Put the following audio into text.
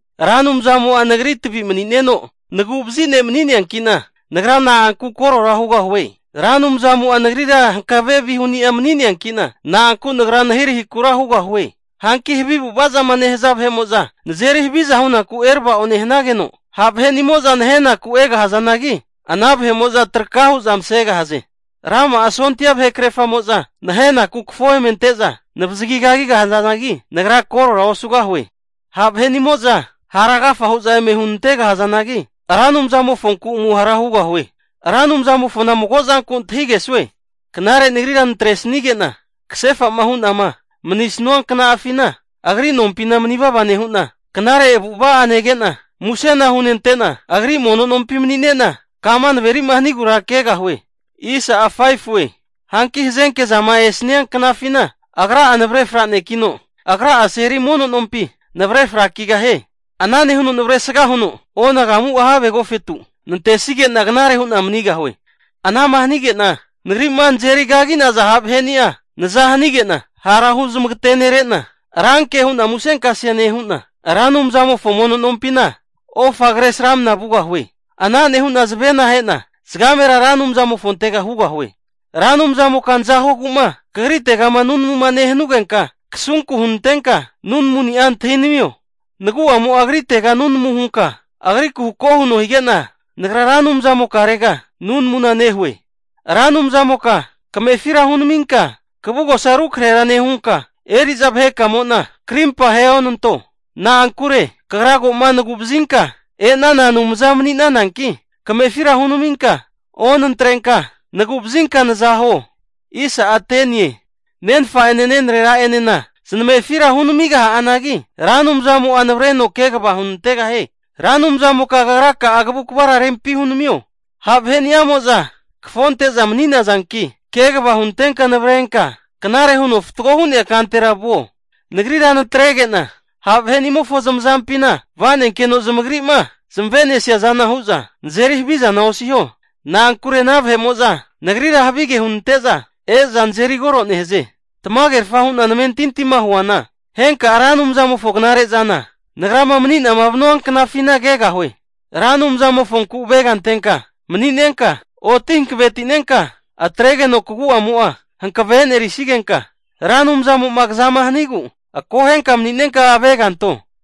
Ra Anumzamo'a nagri tavi mani'neno, nagu'vazi ne' mani'neankina, nagra na'anku korora hugahue? Ra Anumzamo'a nagrira hankave vihuni'a mani'neanki'na, na'anku nagra nahirahikura hugahue? Hanki havi avu'ava zama nehaza vahe'mo'zama nazeri haviza hunaku erava'o nehanageno, ha' vahe'nimo'za nahenaku egahazanagi, ana vahe'mo'za traka hu'za masegahaze. Rama'a sondia vahe kerafamo'za nahenaku kafo eme ante'za navazagi kagigahazanagi, nagra korora osugahue. Ha' vahenimo'za hara agafa hu'za eme hunantegahazanagi, Ra Anumzamofonku amuhara hugahue. Ra Anumzamofona mago zanku antahigesue, Knare nagrira natresanigena kasefa'ma hu'nama manisnua kna'afina, Agri nompina manivava nehu'na, knare avu'ava'a nege'na, musena hunente'na Agri mono nompi mani'nena kama naverima hanigura kegahue. Hanki hazenke zama esania knafina, Agra'a navre franekino, Agra'a seli mono nompi navre frakigahie. Ana nehuno navresga huno onagamu'a have agofetu nantesige'na knare hu'na manigahue. Anama hanige'na nagri'ma nazeri kagi'naza ha' vaheni'a naza hanige'na hara huzmagetenerena, ranke hu'na musenkase nehu'na, Ra Anumzamofo mono nompina ofa kresramna vugahue. Ana nehu'na zavena ahe'na zagamera Ra Anumzamofontega hugahue. Ra Anumzamoka naza huogu'ma kagritegama nunamuma nehanugenka, kasunku hunantenka nunamuni'a antahinamio. Nagu'amo'a agritega nunamu hunka agriku hako huno hige'na, nagra Ra Anumzamokarega nunamuna nehue. Ra Anumzamoka kamefira hunaminka kavugosa rukrahera nehunka, eri'za vahekamo'na krimpa aheonanto. Na'ankure kagra ko'ma nagu'vazinka e'nana Anumza mani'nananki, kamefira hunaminka onatrenka, nagu'vazinka nazahuo. Nenfa'ene nenrera'enena zanamefira hunamigaha'anagi, Ra Anumzamo'a navareno kegava hunantegahie. Ra Anumzamoka Kagra'a kavukvara rempi hunamio. Ha' vaheni'amo'za kafonte'za mani'nazanki, kegava hunantenka navrenka knare huno fatgo hu'nea kantera vuo. Nagrira natrege'na ha' vahe'nimofo zamazampina va'nenkeno zamagri'ma zamavesi'niaza hu'za nazeri havizana osiho. Na'ankure ana vahe'mo'za nagrira havige hunante'za e'za nazeri koro nehaze. Tamagerfa hu'na namentintima huana, henka'a Ra Anumzamofo knare'zana, nagrama mani'nama vanua knafina kegahue. Ra Anumzamofonku avega antenka mani'nenka, oti hankavetinenka atregeno kagu'amo'a hankave enerisnigenka, Ra Anumzamo'ma kazama hanigu akohenka mani'nenka aveganto.